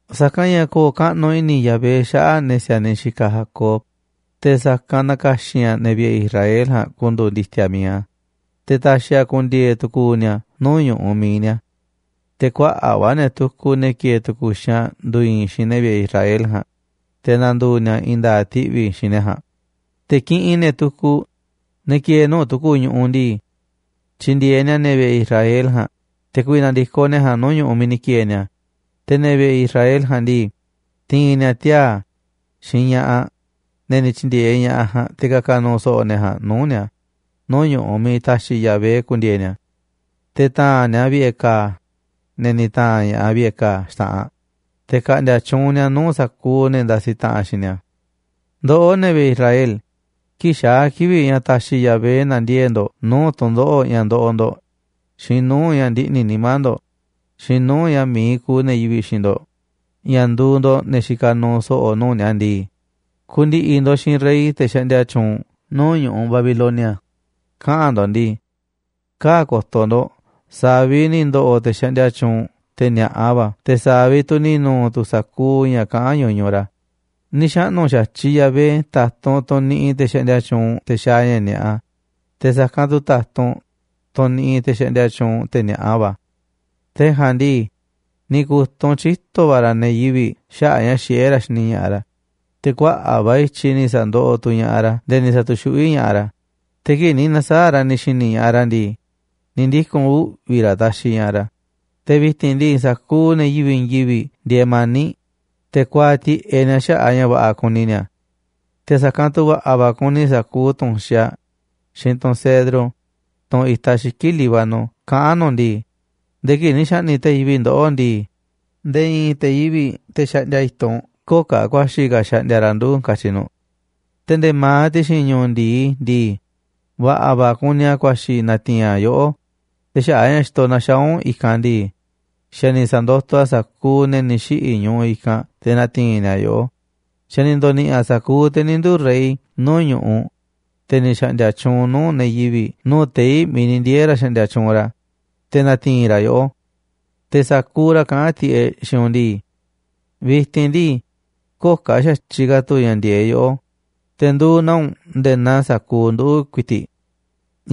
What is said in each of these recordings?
Sa̱kanꞌ ña̱ ko̱o̱ kaꞌnuꞌ i̱ni̱ Yahvé xaꞌa̱ꞌ ne̱ si̱a̱niꞌ xikaꞌ Jacob, te̱ sa̱kanꞌ na̱ka̱xi̱n a̱ ne̱ vi̱ꞌe̱ Israel ja̱a̱nꞌ ku̱ndu̱u̱ ndi̱ti̱a̱ mi̱iꞌ a̱, te̱ ta̱xi̱ a̱ ku̱ndi̱e̱e̱ tu̱ku̱u̱ ni̱a̱ nuu̱ꞌ ñu̱ꞌuꞌ mi̱iꞌ ni̱a̱. Te̱ kuaꞌa̱ꞌ va̱ ne̱ tukuꞌ, ne̱ ki̱e̱e̱ tu̱ku̱ xaanꞌ, ndu̱i̱i̱n xiinꞌ ne̱ vi̱ꞌe̱ Israel ja̱a̱nꞌ, te̱ na̱ndu̱u̱ ni̱a̱ i̱i̱n nda̱a̱ꞌ ti̱ꞌvi̱ xiinꞌ ne̱ ja̱a̱nꞌ. Te̱ kiꞌinꞌ ne̱ tukuꞌ, ne̱ ki̱e̱e̱ nuu̱ꞌ tu̱ku̱ ñu̱ꞌuꞌ ndii, tyi̱ndi̱e̱eꞌ ni̱a̱ ne̱ vi̱ꞌe̱ Israel ja̱a̱nꞌ te̱ ku̱vi̱ na̱ndi̱koꞌ ne̱ ja̱a̱nꞌ nuu̱ꞌ ñu̱ꞌuꞌ miiꞌ ni̱ ki̱e̱e̱ ni̱a̱, te̱ ne̱ vi̱ꞌe̱ Israel ja̱a̱nꞌ ndii, ti̱i̱n ni̱a̱ tiaa̱ xiinꞌ ña̱ꞌaꞌ, ne̱ ni̱ tyi̱ndi̱e̱eꞌ ña̱ꞌaꞌ ja̱a̱nꞌ, te̱ ka̱ka̱ nu̱u̱ so̱ꞌo̱ ne̱ ja̱a̱nꞌ nuu̱ꞌ ni̱a̱ nuu̱ꞌ ñu̱ꞌuꞌ miiꞌ ta̱xi̱ Yahvé ku̱ndi̱e̱e̱ ni̱a̱. Te̱ ta̱a̱nꞌ ni̱a̱ vi̱ꞌe̱ ka̱a̱ ne̱ ni̱ ta̱a̱nꞌ ña̱ꞌaꞌ vi̱ꞌe̱ ka̱a̱ xta̱ꞌanꞌ, te̱ ka̱ꞌndi̱a̱ tyuunꞌ ni̱a̱ nuu̱ꞌ sa̱kuuꞌ ne̱ ndasiꞌ taꞌanꞌ xiinꞌ ni̱a̱. Ndoꞌó, ne̱ vi̱ꞌe̱ Israel, kii̱ꞌ xaa̱ kivi̱ꞌ ña̱ ta̱xi̱ Yahvé na̱ndiee̱ꞌ ndo̱ꞌ nuu̱ꞌ tu̱n ndoꞌo̱ꞌ ña̱ ndoꞌoꞌ ndo̱ꞌ, xiinꞌ nuu̱ꞌ ña̱ ndiꞌni̱ nimá ndo̱ꞌ, xiinꞌ nuu̱ꞌ ña̱ mi̱iꞌ kuuꞌ ne̱ yivi̱ꞌ xiinꞌ ndo̱ꞌ ña̱ nduuꞌ ndo̱ꞌ ne̱ xikaꞌ nuuꞌ so̱ꞌo̱ nuu̱ꞌ ni̱a̱ ndii, ku̱ndi̱ꞌi̱ ndo̱ꞌ xiinꞌ rey, te̱ xaꞌndia tyuunꞌ nuu̱ꞌ ñu̱ꞌuꞌ Babilonia, kaꞌa̱n ndo̱ꞌ ndii: “Kaa̱ꞌ ko̱to̱ ndo̱ꞌ sa̱a̱ vi̱ꞌ ni̱ ndo̱ꞌo̱ te̱ xaꞌndia tyuunꞌ, te̱ ni̱a̱ꞌa va̱, te̱ sa̱a̱ vi̱ꞌ tu̱ ni̱ nu̱u̱ tu̱ sa̱kuuꞌ ña̱ kaꞌán ñuñuꞌ ra̱. Ni̱ xaꞌnu̱ xa̱tyiꞌ Yahvé ta̱tunꞌ, tunꞌ niꞌiꞌ te̱ xaꞌndia tyuunꞌ, te̱ xaaꞌ ña̱ ni̱a̱ꞌa, te̱ sa̱kanꞌ tu̱ ta̱tunꞌ tunꞌ niꞌiꞌ, te̱ xaꞌndia tyuunꞌ, te̱ ni̱a̱ꞌa va̱. Te̱ ja̱a̱nꞌ ndii, ni̱ ku̱tunꞌ tyito̱ va̱ ra̱ ne̱ yivi̱ꞌ xaꞌa̱ꞌ a̱ ña̱ xiꞌé ra̱ xini ña̱ꞌaꞌ ra̱, te̱ kuaꞌa̱ꞌ va̱ i̱tyiꞌ ni̱ sa̱ndoꞌoꞌ tu̱ ña̱ꞌaꞌ ra̱ nde̱e̱ ni̱ sa̱tu̱xuꞌví ña̱ꞌaꞌ ra̱, te̱ kii̱ꞌ ni̱ na̱saa̱ꞌ ra̱ ni̱ xi̱ni̱ ña̱ꞌaꞌ ra̱ ndii, ni̱ ndiku̱n uꞌvi̱ ra̱ taxiꞌ ña̱ꞌaꞌ ra̱. Te̱ vi̱ti̱n ndii, sa̱kuuꞌ ne̱ yivi̱ꞌ i̱i̱n yivi̱ꞌ ndieeꞌ mani̱ꞌ, te̱ kuaaꞌ tiꞌeꞌ ni̱a̱ xaꞌa̱ꞌ a̱ ña̱ va̱ꞌa̱ kuni ni̱a̱. Te̱ sa̱kanꞌ tu̱ va̱ꞌa̱ va̱ kuni sa̱kuuꞌ tu̱nxaꞌ, xiinꞌ tunꞌ cedro, tunꞌ itaꞌ xiki̱ꞌ Líbano kaꞌán nu̱ꞌ ndii: Nde̱e̱ kii̱ꞌ ni̱ xa̱ꞌni̱ꞌ te̱ yivi̱ꞌ ndoꞌó ndii, nde̱e̱ i̱i̱n te̱ yivi̱ꞌ, te̱ xaꞌndia i̱tunꞌ, köo̱ꞌ ka̱ ku̱a̱xi̱ ka̱ xaꞌndia ra̱ nduꞌu̱, katyi̱ nu̱ꞌ. ’Te̱ nde̱e̱ ma̱aꞌ ti̱xi̱n ñu̱u̱ ndi̱i ndii, va̱ꞌa̱ va̱ kuni a̱ ku̱a̱xi̱ na̱ti̱i̱n a̱ yoꞌó, te̱ xaꞌa̱ꞌ a̱ xa̱ xitoꞌ na̱xaa̱ u̱nꞌ i̱kanꞌ ndii, xa̱ ni̱ sa̱ndotoꞌ a̱ sa̱kuuꞌ ne̱ ni̱ xiꞌi̱ ñuꞌuꞌ i̱kanꞌ te̱ na̱ti̱i̱n ni̱a̱ yoꞌó, xa̱ ni̱ ndo̱ni̱ꞌi̱ a̱ sa̱kuuꞌ te̱ ni̱ nduu̱ rey nuu̱ꞌ ñu̱ꞌuꞌ, te̱ ni̱ xa̱ꞌndi̱a̱ tyuunꞌ nuu̱ꞌ ne̱ yivi̱ꞌ nuu̱ꞌ tei̱ miiꞌ ndieeꞌ ra̱ xaꞌndia tyuunꞌ ra̱, te̱ na̱ti̱i̱n ra̱ yoꞌó. Te̱ sa̱kuuꞌ ra̱ kaꞌán tiꞌeꞌ xiinꞌ u̱nꞌ ndii: Vi̱ti̱n ndii, köo̱ꞌ ka̱ xa̱tyiꞌ ka̱ tu̱ ña̱ ndi̱e̱e̱ꞌ yoꞌó, te̱ nduuꞌ naa u̱nꞌ nde̱e̱ naa sa̱kuuꞌ nduꞌu̱ ku̱i̱ti̱ꞌ.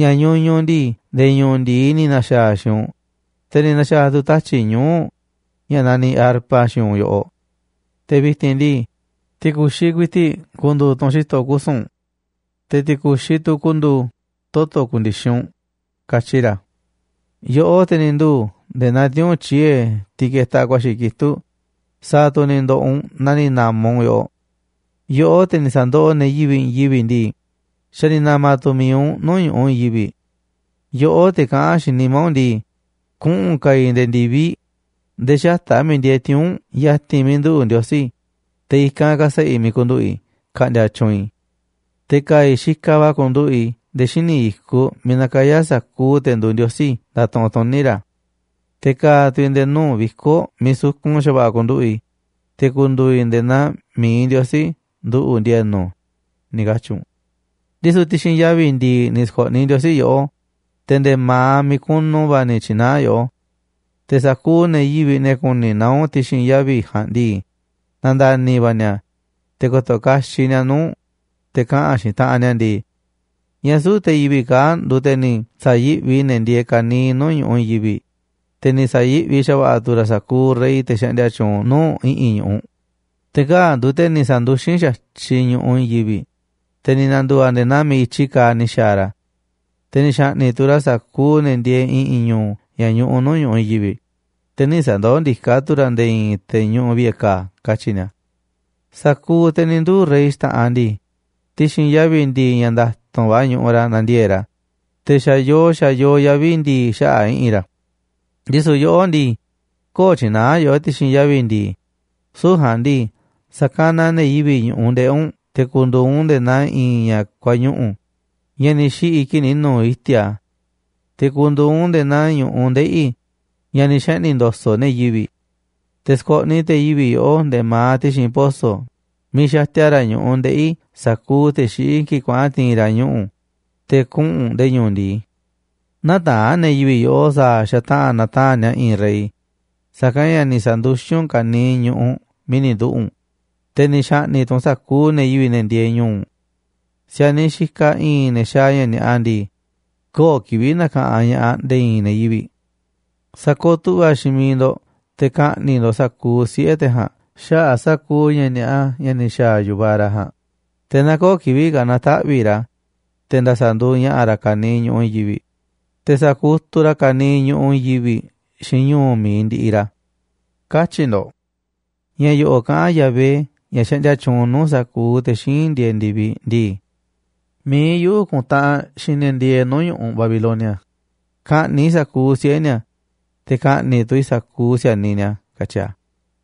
Ña̱ ñuñuꞌ u̱nꞌ ndii, nde̱e̱ ñu̱u̱ ndi̱i ni̱ na̱xa̱a̱ a̱ xiinꞌ u̱nꞌ, te̱ ni̱ na̱xa̱a̱ tu̱ tatyi̱ꞌ ñuu̱ꞌ ña̱ naniꞌ arpa xiinꞌ u̱nꞌ yoꞌoꞌ. Te̱ vi̱ti̱n ndii, ti̱ku̱xiꞌ ku̱i̱ti̱ꞌ ku̱ndu̱u̱ tunꞌ xi̱to̱ kusu̱n u̱nꞌ, te̱ ti̱ku̱xiꞌ tu̱ ku̱ndu̱u̱ toto̱ ku̱ndi̱xi̱n u̱nꞌ, katyi ra̱. ’Yoꞌó, te̱ ni̱ nduu̱ nde̱e̱ naa tiuu̱nꞌ tyiee̱, tiꞌ ketaꞌ ku̱a̱xi̱ kitúꞌ, sa̱a̱ tu̱ ni̱ ndo̱ꞌo̱ u̱nꞌ na ni̱ na̱ma̱ u̱nꞌ. Yoꞌó te̱ ni̱ sa̱ndoꞌoꞌ ne̱ yivi̱ꞌ i̱i̱n yivi̱ꞌ ndii, xa̱ ni̱ na̱ma̱ tu̱ mi̱iꞌ u̱nꞌ nuu̱ꞌ ñu̱ꞌuꞌ i̱i̱n yivi̱ꞌ. Yoꞌó, te̱ kaꞌán xiinꞌ nimá u̱nꞌ ndii: Kuꞌu̱n ka̱a̱ i̱ nde̱e̱ ndi̱viꞌ nde̱e̱ xata̱ꞌ a̱ miiꞌ ndieeꞌ tiuu̱nꞌ ya̱ti̱n miiꞌ nduꞌu̱ Ndiosí, te̱ i̱kanꞌ ka̱sa̱ꞌa̱ i̱ miiꞌ ku̱nduꞌu̱ꞌ i̱ ka̱ꞌndi̱a̱ tyuunꞌ i̱. Te̱ ka̱a̱ i̱ xikaꞌ va̱ ku̱nduꞌu̱ꞌ i̱ nde̱e̱ xíniꞌ i̱kuꞌ miiꞌ nakayá sa̱kuuꞌ te̱ nduuꞌ ndiosí ndatuꞌunꞌ tuní ra̱. Te̱ ka̱a̱ tu̱ i̱ nde̱e̱ nuu̱ꞌ viko̱ꞌ miiꞌ sukun xa̱va̱ꞌa̱ ku̱nduꞌu̱ꞌ i̱, te̱ ku̱ndu̱u̱ i̱ nde̱e̱ naa mi̱iꞌ Ndiosí nduꞌu̱ꞌ ndi̱e̱nu̱, ni̱ katyi̱ u̱nꞌ. Ndisu̱ ti̱xi̱n yavi̱ ndi̱i̱ ni̱ sko̱ꞌniꞌ Ndiosí yoꞌó, te̱ nde̱e̱ ma̱aꞌ miiꞌ kunu va̱ ni̱ tyi̱naá a̱ yoꞌó. Te̱ sa̱kuuꞌ ne̱ yivi̱ꞌ, ne̱ ku̱ni̱ naá u̱nꞌ ti̱xi̱n yavi̱ ja̱a̱nꞌ ndii, na̱nda̱ni̱ va̱ ni̱a̱, te̱ ko̱to̱ kaxiꞌ ni̱a̱ nuu̱ꞌ u̱nꞌ, te̱ kaꞌa̱n xiinꞌ taꞌanꞌ ni̱a̱ ndii: ¿Ñáá süu̱ꞌ te̱ yivi̱ꞌ kaa̱ꞌ nduuꞌ te̱ ni̱ sa̱yi̱ꞌvi ne̱ ndieeꞌ ka̱niiꞌ nuu̱ꞌ ñu̱ꞌuꞌ i̱i̱n yivi̱ꞌ, te̱ ni̱ sa̱yi̱ꞌvi xa̱va̱ꞌa̱ tu̱ ra̱ sa̱kuuꞌ rey, te̱ xaꞌndia tyuunꞌ nuu̱ꞌ i̱ꞌi̱n ñu̱ꞌuꞌ? Te̱ kaa̱ꞌ nduuꞌ te̱ ni̱ sa̱nduxín xa̱tyiꞌ ñu̱ꞌuꞌ i̱i̱n yivi̱ꞌ, te̱ ni̱ na̱ndu̱u̱ a̱ nde̱e̱ naa miiꞌ i̱tyiꞌ kaaꞌ ni̱ xa̱a̱ ra̱. Te̱ ni̱ xa̱ꞌni̱ꞌ tu̱ ra̱ sa̱kuuꞌ ne̱ ndieeꞌ i̱ꞌi̱n ñu̱u̱ ña̱ ñuꞌuꞌ nuu̱ꞌ ñu̱ꞌuꞌ i̱i̱n yivi̱ꞌ, te̱ nï̱ sa̱ndoó ndiká tu̱ ra̱ nde̱e̱ i̱i̱n te̱ ñuꞌuꞌ vi̱ꞌe̱ ka̱a̱, katyi̱ ni̱a̱. ’Sa̱kuuꞌ te̱ ni̱ nduu̱ rey xta̱ꞌanꞌ ndii, ti̱xi̱n yavi̱ ndi̱i̱ ña̱ nda̱tu̱nꞌ va̱ ñuꞌuꞌ ra̱ nandiee̱ꞌ ra̱, te̱ xa̱yoo, xa̱yoo yavi̱ ndi̱i̱ xaꞌa̱ꞌ i̱ꞌi̱n ra̱. Ndisu̱ yoꞌó ndii, köo̱ꞌ tyi̱naá yoꞌó ti̱xi̱n yavi̱ ndii, süu̱ꞌ ja̱a̱nꞌ ndii, sa̱kanaꞌ ne̱ yivi̱ꞌ ñu̱ꞌuꞌ ndeꞌi̱ u̱nꞌ te̱ ku̱ndu̱u̱ u̱nꞌ nde̱e̱ naa i̱i̱n ña̱ kuañuꞌu̱ꞌ, ña̱ ni̱ xiꞌi̱ kii̱ꞌ ni̱ nu̱u̱ iti̱a̱ a̱. Te̱ ku̱ndu̱u̱ u̱nꞌ nde̱e̱ naa ñu̱ꞌuꞌ ndeꞌi̱ ña̱ ni̱ xeꞌni̱ ndo̱so̱ꞌ ne̱ yivi̱ꞌ. Te̱ sko̱ꞌniꞌ te̱ yivi̱ꞌ yoꞌó nde̱e̱ ma̱aꞌ ti̱xi̱n poso̱ miiꞌ xatia ra̱ ñu̱ꞌuꞌ ndeꞌi̱ sa̱kuuꞌ te̱ xiꞌí kii̱ꞌ kuaꞌa̱n ti̱i̱n ra̱ ñuꞌu̱, te̱ kuꞌu̱n u̱nꞌ nde̱e̱ ñu̱u̱ ndi̱i. Nätaa̱nꞌ ne̱ yivi̱ꞌ yoꞌó sa̱a̱ xataꞌa̱n na̱taa̱nꞌ ni̱a̱ i̱i̱n rey, sa̱kanꞌ ña̱ ni̱ sa̱nduxín u̱nꞌ ka̱niiꞌ ñu̱ꞌuꞌ miiꞌ ni̱ nduꞌu̱ꞌ u̱nꞌ, te̱ ni̱ xa̱ꞌni̱ꞌ tu̱ u̱nꞌ sa̱kuuꞌ ne̱ yivi̱ꞌ, ne̱ ndieeꞌ ñu̱u̱ u̱nꞌ. ’Si̱a̱niꞌ xikaꞌ i̱i̱n ne̱ xaaꞌ ña̱ ni̱a̱ꞌa ndii, köo̱ꞌ kivi̱ꞌ na̱ka̱ꞌanꞌ ña̱ꞌaꞌ nde̱e̱ i̱i̱n ne̱ yivi̱ꞌ. Sa̱kooꞌ tu̱ꞌva̱ xiinꞌ miiꞌ ndo̱ꞌ te̱ ka̱ꞌni̱ꞌ ndo̱ꞌ sa̱kuuꞌ siꞌe̱ te̱ ja̱a̱nꞌ xaꞌa̱ꞌ sa̱kuuꞌ ña̱ ni̱a̱ꞌa ña̱ ni̱ xa̱a̱ yu̱vaꞌ ra̱ ja̱a̱nꞌ, te̱ na köo̱ꞌ kivi̱ꞌ ka̱ na̱taꞌvi̱ꞌ ra̱, te̱ nda̱sa̱ nduuꞌ ña̱ꞌa̱ ra̱ ka̱niiꞌ ñu̱ꞌuꞌ i̱i̱n yivi̱ꞌ, te̱ sa̱kutuꞌ ra̱ ka̱niiꞌ nuu̱ꞌ ñu̱ꞌuꞌ i̱i̱n yivi̱ꞌ xiinꞌ ñu̱u̱ mi̱iꞌ ndiꞌiꞌ ra̱”, katyi̱ ndo̱ꞌ. Ña̱ yo̱ꞌo̱ꞌ kaꞌán Yahvé, ña̱ xaꞌndia tyuunꞌ nuu̱ꞌ sa̱kuuꞌ te̱ xíinꞌ ndieeꞌ ndi̱viꞌ ndii: “Mi̱iꞌ yuꞌu̱ kuntaꞌanꞌ xiinꞌ ne̱ ndieeꞌ nuu̱ꞌ ñu̱ꞌuꞌ Babilonia ka̱ꞌni̱ꞌ i̱ sa̱kuuꞌ siꞌe̱ ni̱a̱, te̱ ka̱ꞌni̱ꞌ tu̱ i̱ sa̱kuuꞌ si̱a̱niꞌ ni̱a̱”, katyi a̱.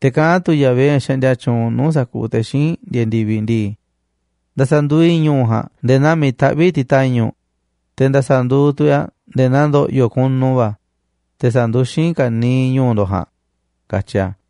Te̱ kaꞌán tu̱ Yahvé, ña̱ xaꞌndia tyuunꞌ nuu̱ꞌ sa̱kuuꞌ te̱ xíinꞌ ndieeꞌ ndi̱viꞌ ndii: “Nda̱sa̱ nduuꞌ i̱ ñu̱u̱ ja̱a̱nꞌ nde̱e̱ naa miiꞌ taꞌvíꞌ ti̱ta̱ñu̱ꞌ, te̱ nda̱sa̱ nduuꞌ tu̱ i̱ a̱ nde̱e̱ naa ndo̱ꞌyo̱ kunu va̱, te̱ sa̱nduxín i̱ ka̱niiꞌ ñu̱u̱ ndo̱ꞌ ja̱a̱nꞌ”, katyi a̱.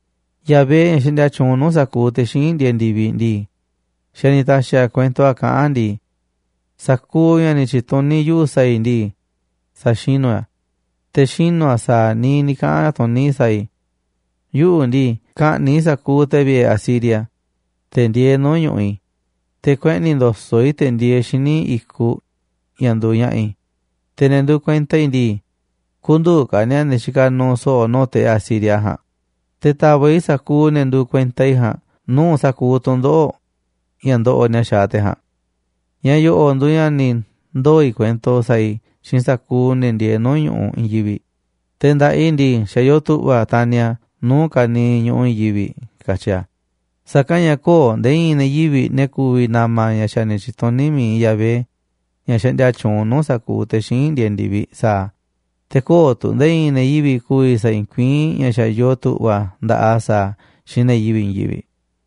Yahvé, ña̱ xaꞌndia tyuunꞌ nuu̱ꞌ sa̱kuuꞌ te̱ xíinꞌ ndieeꞌ ndi̱viꞌ ndii, xa̱ ni̱ ta̱xi̱ a̱ kuento a̱ kaꞌán a̱ ndii: “Sa̱kuuꞌ ña̱ ni̱ tyi̱tuní yuꞌu̱ sa̱a̱ i̱ ndii, sa̱xinu̱ i̱ a̱, te̱ xinu̱ a̱ sa̱a̱ niiꞌ ni̱ kaꞌa̱n tuní i̱ sa̱a̱ i̱. Yuꞌu̱ ndii, ka̱ꞌni̱ꞌ i̱ sa̱kuuꞌ te̱ vi̱ꞌe̱ Asiria, te̱ ndieeꞌ nuu̱ꞌ ñu̱ꞌuꞌ i̱, te̱ kueꞌni̱ ndo̱so̱ꞌ i̱ te̱ ndieeꞌ xíniꞌ i̱kuꞌ ña̱ nduuꞌ ña̱ꞌa̱ i̱, te̱ ne̱ nduuꞌ kuenta i̱ ndii, kü̱ndu̱u̱ ka̱ ni̱a̱ ne̱ xikaꞌ nuuꞌ so̱ꞌo̱ nuu̱ꞌ te̱ Asiria ja̱a̱nꞌ, te̱ ta̱va̱ꞌ i̱ sa̱kuuꞌ ne̱ nduuꞌ kuenta i̱ ja̱a̱nꞌ nuu̱ꞌ sa̱kuuꞌ tu̱ndoꞌo̱ꞌ ña̱ ndoꞌoꞌ ni̱a̱ xaaꞌ te̱ ja̱a̱nꞌ. Ña̱ yo̱ꞌo̱ꞌ nduuꞌ ña̱ ni̱ ndoo̱ i̱ kuento sa̱a̱ i̱ xiinꞌ sa̱kuuꞌ ne̱ ndieeꞌ nuu̱ꞌ ñu̱ꞌuꞌ i̱i̱n yivi̱ꞌ, te̱ nda̱ꞌaꞌ i̱ ndii, xa̱ yoo tu̱ꞌva̱ a̱ taniꞌ a̱ nuu̱ꞌ ka̱niiꞌ ñu̱ꞌuꞌ i̱i̱n yivi̱ꞌ”, katyi a̱. Sa̱kanꞌ ña̱ köo̱ꞌ nde̱e̱ i̱i̱n ne̱ yivi̱ꞌ, ne̱ ku̱vi̱ na̱ma̱ ña̱ xa̱ ni̱ tyi̱tuní mi̱iꞌ Yahvé, ña̱ xaꞌndia tyuunꞌ nuu̱ꞌ sa̱kuuꞌ te̱ xíinꞌ ndieeꞌ ndi̱viꞌ, sa̱a̱ a̱. Te̱ köo̱ꞌ tu̱ nde̱e̱ i̱i̱n ne̱ yivi̱ꞌ ku̱vi̱ sa̱i̱i̱n kuiín ña̱ xa̱ yoo tu̱ꞌva̱ nda̱ꞌaꞌ a̱ sa̱a̱ a̱ xiinꞌ ne̱ yivi̱ꞌ i̱i̱n yivi̱ꞌ.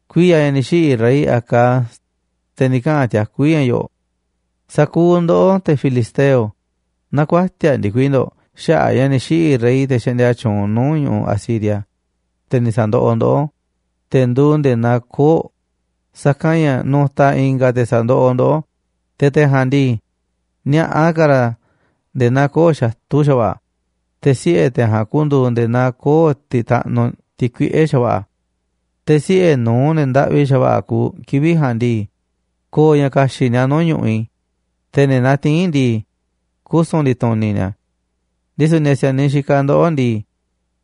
Kuiya̱ ña̱ ni̱ xiꞌi̱ rey Acaz, te̱ ni̱ kaꞌa̱n tiakú i̱ ña̱ yo̱ꞌo̱ꞌ: “Sa̱kuuꞌ ndoꞌó, te̱ filisteo, näkuatiaꞌ ndikui ndo̱ꞌ xaꞌa̱ꞌ a̱ ña̱ ni̱ xiꞌi̱ rey, te̱ xaꞌndia tyuunꞌ nuu̱ꞌ ñu̱ꞌuꞌ Asiria, te̱ ni̱ sa̱ndoꞌoꞌ ndoꞌó, te̱ nduuꞌ nde̱e̱ naa koo̱ꞌ, sa̱kanꞌ ña̱ nu̱ta̱ i̱nga̱ te̱ sa̱ndoꞌoꞌ ndoꞌó, te̱ te̱ ja̱a̱nꞌ ndii, ni̱a̱ꞌa ka̱ ra̱ nde̱e̱ naa koo̱ꞌ xatu̱ xa̱va̱ꞌa̱, te̱ siꞌe̱ te̱ ja̱a̱nꞌ ku̱ndu̱u̱ nde̱e̱ naa koo̱ꞌ tiꞌ taꞌnuꞌ, tiꞌ kuiꞌe̱ xa̱va̱ꞌa̱. Te̱ siꞌe̱ nu̱uꞌ ne̱ ndaꞌvi xa̱va̱ꞌa̱ kuuꞌ kivi̱ꞌ ja̱a̱nꞌ ndii, ko̱o̱ ña̱ ka̱xi̱ꞌ ni̱a̱ nuu̱ꞌ ñu̱ꞌuꞌ i̱, te̱ ne̱ natiín ndii, kusu̱n ndi̱tu̱ni̱ ni̱a̱. Ndisu̱ ne̱ si̱a̱niꞌ xikaꞌ ndoꞌó ndii,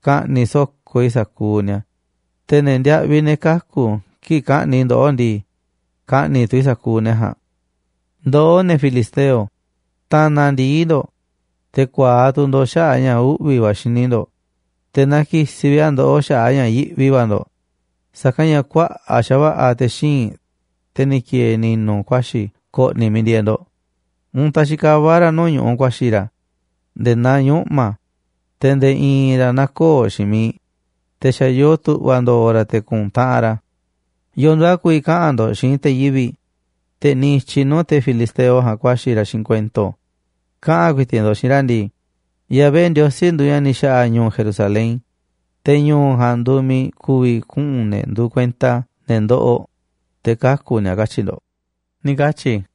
ka̱ꞌni̱ꞌ so̱ko̱ i̱ sa̱kuuꞌ ni̱a̱, te̱ ne̱ ndiaꞌviꞌ, ne̱ kaku̱ kii̱ꞌ ka̱ꞌni̱ꞌ i̱ ndoꞌó ndii, ka̱ꞌni̱ꞌ tu̱ i̱ sa̱kuuꞌ ne̱ ja̱a̱nꞌ. Ndoꞌó, ne̱ filisteo, ta̱na̱ ndi̱i ndo̱ꞌ, te̱ ku̱a̱aꞌ tu̱ ndo̱ꞌ xaꞌa̱ꞌ a̱ ña̱ uꞌvi̱ va̱ xini ndo̱ꞌ, te̱ na ki̱si̱ vi̱ꞌ a̱ ndoꞌó xaꞌa̱ꞌ a̱ ña̱ yiꞌvi va̱ ndo̱ꞌ, sa̱kanꞌ ña̱ kuaꞌa̱ꞌ xa̱va̱ꞌa̱ te̱ xíinꞌ, te̱ ni̱ ki̱e̱e̱ ni̱nu̱, ku̱a̱xi̱ ko̱ꞌni̱ miiꞌ ndieeꞌ ndo̱ꞌ, untaꞌ xikavá ra̱ nuu̱ꞌ ñu̱ꞌuꞌ ku̱a̱xi̱ ra̱ nde̱e̱ naa ñuꞌma̱, te̱ nde̱e̱ i̱i̱n ra̱ näkooꞌ xiinꞌ miiꞌ, te̱ xa̱yoo tu̱ꞌva̱ ndo̱o̱ ra̱ te̱ ku̱ntaꞌanꞌ ra̱. ¿Yo̱o̱ nduuꞌ a̱ ku̱vi̱ kaꞌa̱n ndo̱ꞌ xiinꞌ te̱ yivi̱ꞌ, te̱ niꞌiꞌ i̱tyiꞌ nuu̱ꞌ te̱ filisteo ja̱a̱nꞌ ku̱a̱xi̱ ra̱ xiinꞌ kuento? Kaꞌa̱n ku̱i̱ti̱ꞌ ndo̱ꞌ xiinꞌ ra̱ ndii: Yahvé Ndiosí nduuꞌ ña̱ ni̱ xa̱ꞌa̱ ñu̱u̱ Jerusalén, te̱ ñu̱u̱ ja̱a̱nꞌ nduuꞌ miiꞌ ku̱vi̱ kuꞌu̱n ne̱ nduuꞌ kuenta a̱, ne̱ ndoꞌoꞌ, te̱ kaku̱ ni̱a̱, katyi̱ ndo̱ꞌ”, ni̱ katyi̱ i̱.